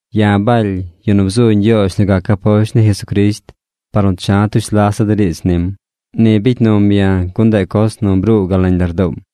Ya̱ Baly, yu nu bzu Ñgyoozh nu gac aposht ni Jesucrisht par nu cha̱ tush lasa̱ de riidz nim. Ni bicy num ya̱ gun ndeꞌ coz nu bruu gal nañ lardoom.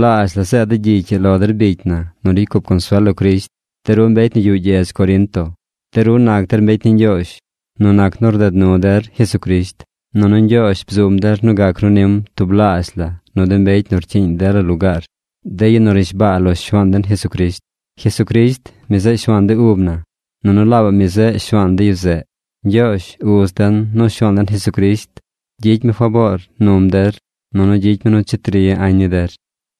zeed de̱ gyicy ii lo der bicy na nu ricy cup consuel lo Crisht, de ru mbecy nu yuꞌ gyedz Corinto. De ru nac der mbecy ni Ñgyoozh nu nac nu rded nu der Jesucrisht, nunu Ñgyoozh bzum der nu gac ru nim tublaazh la nu de mbecy nu rcyiiñ dela lugaar, de yu nu rnishbaa lo Shuaan den Jesucrisht. Jesucrisht, mi zeꞌ Shuaan de ub na, nunu laabaꞌ mi zeꞌ Shuaan de yu zeꞌ. Ñgyoozh, Uz den, nu Shuaan den Jesucrisht gyicy mi faboor num der nunu gyicy mi nu cheti ri añ ni der.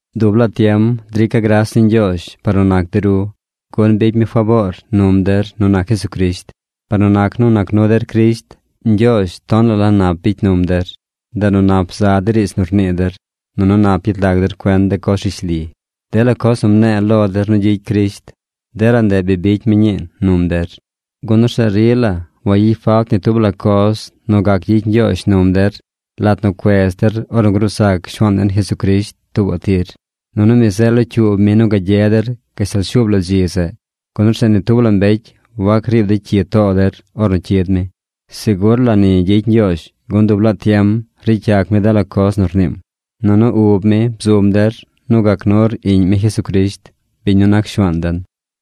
Dub laa tiem drica̱ gras ni Ñgyoozh par nu nac de ru, gun bicy mi faboor num der nu nac Jesucrisht. Par nu nac nu nac nu der Crisht, Ñgyoozh tonaꞌ la nap bicy num der. Ndeꞌ nu nap za de riidz nu rnii der, nunu nap yet lag der cuen de coz rishli. Dela coz nu mne̱e̱ lo der nu gyicy Crisht, dela ndeꞌ bi bicy mi ñii num der. Gun orzeꞌ rila wayicy falt ni tub la coz nu gac gyicy Ñgyoozh num der lat nu cuez der ornu gruu zac Shuaan den Jesucrisht tuubaꞌ tir. Nunu mi zeꞌ locyuub mi nu gagye der gashtal shuub la dzi zeꞌ, gun orzeꞌ ni tub la mbecy wac riib dey cyi too der ornu cyid mi. Segur la ni gyicy Ñgyoozh, gun dub laa tiem ricy yac mi dela coz nu rniim. Nunu ub mi bzum der nu gac nur Iꞌñ mi Jesucrisht, biñ nu nac Shuaan den.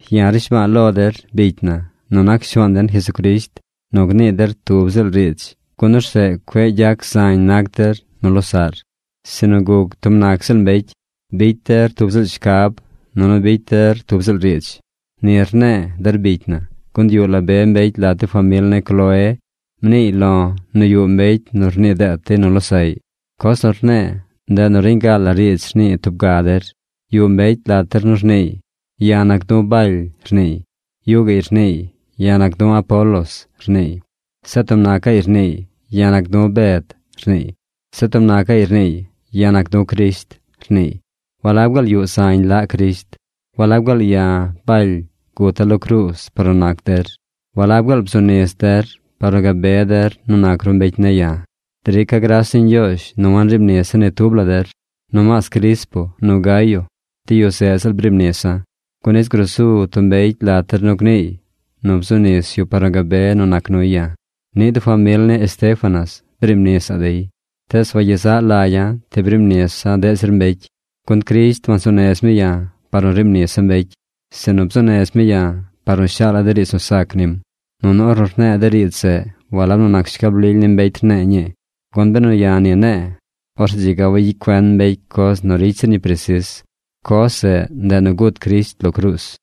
Ya̱ rnishba̱a̱ lo der, bicy na, nu nac Shuaan den Jesucrisht, nu gnii der tub ziꞌl riidz gun orzeꞌ cueꞌ gyac zañ nac der nu losaꞌr, sinu guc tub nac ziꞌl mbecy. Bicy der tub ziꞌl shcab, nunu bicy der tub ziꞌl riidz. Ni rne̱e̱, der bicy na, gun yuꞌ la be mbecy lat de famil ni Cloé, mniiy lo̱ nu yuꞌ mbecy nu rnii deet dey nu losaꞌy. Coz nu rne̱e̱, ndeꞌ nu reñ ga la riidz rnii tub ga der. Yuꞌ mbecy lat der nu rniiy: “Ya̱ nac du̱ Baly”, rniiy. Yuꞌ gaꞌy rniiy: “Ya̱ nac du̱ Apolos”, rniiy. Zeꞌ tub nacaꞌy rniiy: “Ya̱ nac du̱ Bed”, rniiy. Zeꞌ tub nacaꞌy rniiy: “Ya̱ nac du̱ Crisht”, rniiy. ¿Walab gaal yuꞌ zañ laꞌ Crisht? ¿Walab gaal ya̱, Baly, guta̱ lo cruuz par nu nac der? ¿Walab gaal bzu nis der par nu gabe der nu nac ru mbecy ne̱ ya̱? ¡Drica̱ gras ni Ñgyoozh nu wanriib nisa̱ ni tub la der! Nomaas Crispo nu Gayo, de yu zeꞌ ziꞌl briib nisa̱, gun nis gruu su tub mbecy lat der nu gniiy nu bzu nis yu par nu gabe nu nac nuy ya̱. Niꞌ de famil ni Estéfanas briib nisa̱ꞌ dey, tees wagyezaꞌ lagya̱ ti briib nisa̱ deꞌ zir mbecy. Gun Crisht wansuu nez mi ya̱ par nu riib nisa̱ mbecy, sinu bzuu nez mi ya̱ par nu shaala̱ de riidz nu sac nim. Nunu ornu rne̱e̱ de riidz zeꞌ, walab nu nac shcab lily ni mbecy rne̱e̱ ñii, gun benu ya̱ ni ne̱e̱, orzeꞌ dzi ga wayicy cuen mbecy coz nu ricy zir ñi presis. Coz zeꞌ, ndeꞌ nu gut Crisht lo cruuz.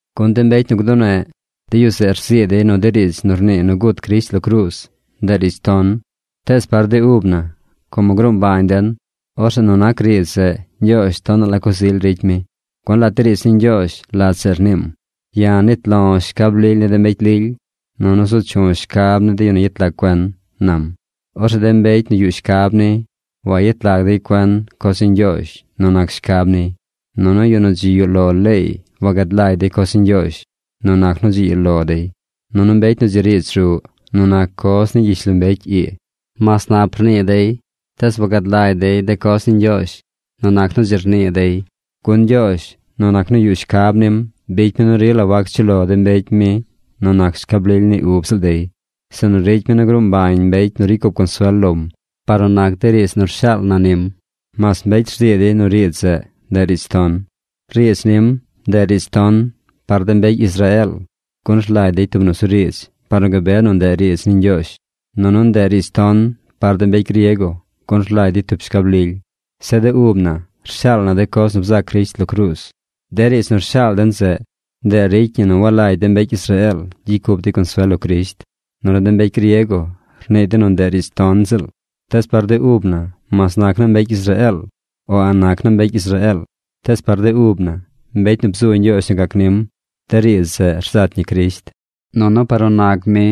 Gun de mbecy nu gduneꞌ, de yu zeꞌ rzii dey nu de riidz nu rnii nu gut Crisht lo cruuz, ndeꞌ riidz ton. Tees par de ub na, como gruu mbañ den, orzeꞌ nu nac riidz zeꞌ, Ñgyoozh tonaꞌ la coz ily ricy mi. Gun lat de riidz ni Ñgyoozh, lat zeꞌ rniim: Ya̱ nit lo̱ shcab lily ni de mbecy lily, nunu zu chu̱ shcab ni de yu nu yet lag cuen, nam. Orzeꞌ de mbecy nu yuꞌ shcab ni, wayet lag dey cuen coz ni Ñgyoozh nu nac shcab niy. Nunu yu nu dzi yuꞌ lo leey wagad lagy dey coz ni Ñgyoozh nu nac nu dzi yuꞌ lo dey. Nunu mbecy nu dzi riidz ruꞌ nu nac coz ni gyishlombecy ii, mas nap rnii dey tees wagad lagy dey de coz ni Ñgyoozh nu nac nu dzi rnii dey. Gun Ñgyoozh, nu nac nu yuꞌ shcab nim, bicy mi nu rila wac chuꞌ lo de mbecy mi nu nac shcab lily ni de ub ziꞌl dey. Sinu ricy mi nu gruu mbañ mbecy nu ricy cup consuel lom par nu nac de riidz nu rshaal na nim, mas mbecy rzii dey nu riidz zeꞌ, ndeꞌ riidz ton. Riidz nim, ndeꞌ riidz ton par de mbecy Israeel, gun rlagy dey tub nusuriidz par nu gabe nu ndeꞌ riidz ni Ñgyoozh. Nunu ndeꞌ riidz ton par de mbecy griego, gun rlagy dey tub shcab lily. Zeꞌ de ub na rshaal na de coz nu bzac Crisht lo cruuz. De riidz nu rshaal den zeꞌ, ndeꞌ ricy ñi nu walagy de mbecy Israeel gyicy cup dey consuel lo Crisht, nunu de mbecy griego rnii dey nu ndeꞌ riidz ton ziꞌl. Tees par de ub na mas nac naa mbecy Israeel, o a̱ꞌ nac naa mbecy Israeel, tees par de ub na, mbecy nu bzu Ñgyoozh nu gac nim, de riidz zeꞌ rzat ñi Crisht. Nunu par nu nac mi,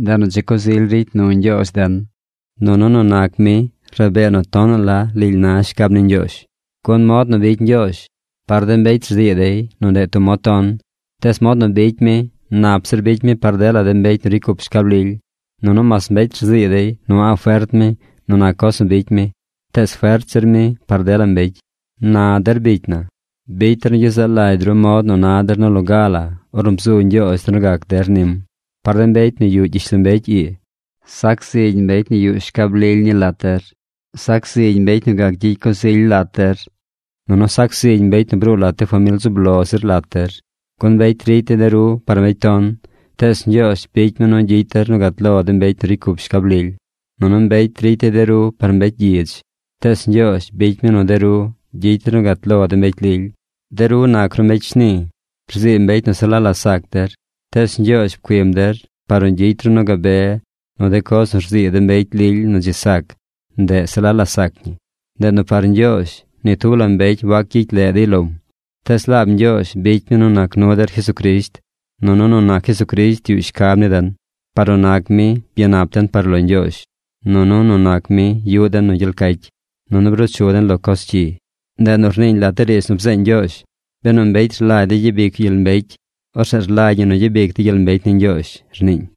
ndeꞌ nu dzi coz ily ricy nu Ñgyoozh den. Nunu nu nac mi rabee nu tonaꞌ la lily na shcab ni Ñgyoozh. Gun mod nu bicy Ñgyoozh, par de mbecy rzii dey nu ndeꞌ tub mod ton, tees mod nu bicy mi nap zir bicy mi par dela de mbecy nu ricy cup shcab lily. Nunu mas mbecy rzii dey nu a̱ꞌ fert mi nu nac coz nu bicy mi, tees fert zir mi par dela mbecy. Na, der bicy na, bicy der nu gyezaꞌ lagy ru mod nu na der nu lo ga ornu bzu Ñgyoozh der nu gac der nim. Par de mbecy nu yuꞌ gyishlombecy ii, sac zigy mbecy nu yuꞌ shcab lily ni lat der. Sac zigy mbecy nu gac gyicy coz ily lat der. Nunu sac zigy mbecy nu bruu lat de famil zub lo zir lat der. Gun mbecy ricy dey de ru par mbecy ton, tees Ñgyoozh bicy mi nu gyicy der nu gat lo de mbecy nu ricy cup shcab lily. Nunu mbecy ricy dey de ru par mbecy gyidz. Tees Ñgyoozh bicy mi nu de ru gyicy der nu gat lo de mbecy lily. De ru nac ru mbecy shni. Rzii mbecy nu se la la sac der. Tees Ñgyoozh pcuim der par nu gyicy ru nu gabe nu de coz nu rzii de mbecy lily nu dzi sac, ndeꞌ se la la sac ñi. Ndeꞌ nu par Ñgyoozh ni tub la mbecy wac gyicy leꞌ dey lom. Tees laab Ñgyoozh bicy mi nu nac nu der Jesucrisht, nunu nu nac Jesucrisht yuꞌ shcab ni den. Par nu nac mi, byanap den par lo Ñgyoozh. Nunu nu nac mi yuꞌ den nu gyel cacy, nunu bruu chu den lo coz cyi. Ndeꞌ nu rniiñ lat de riidz nu bzeeñ Ñgyoozh: “Benu mbecy rlagy dey gyabic yu gyel mbecy, orzeꞌ rlagy ñi nu gyabic dey gyel mbecy ni Ñgyoozh”, rniiñ.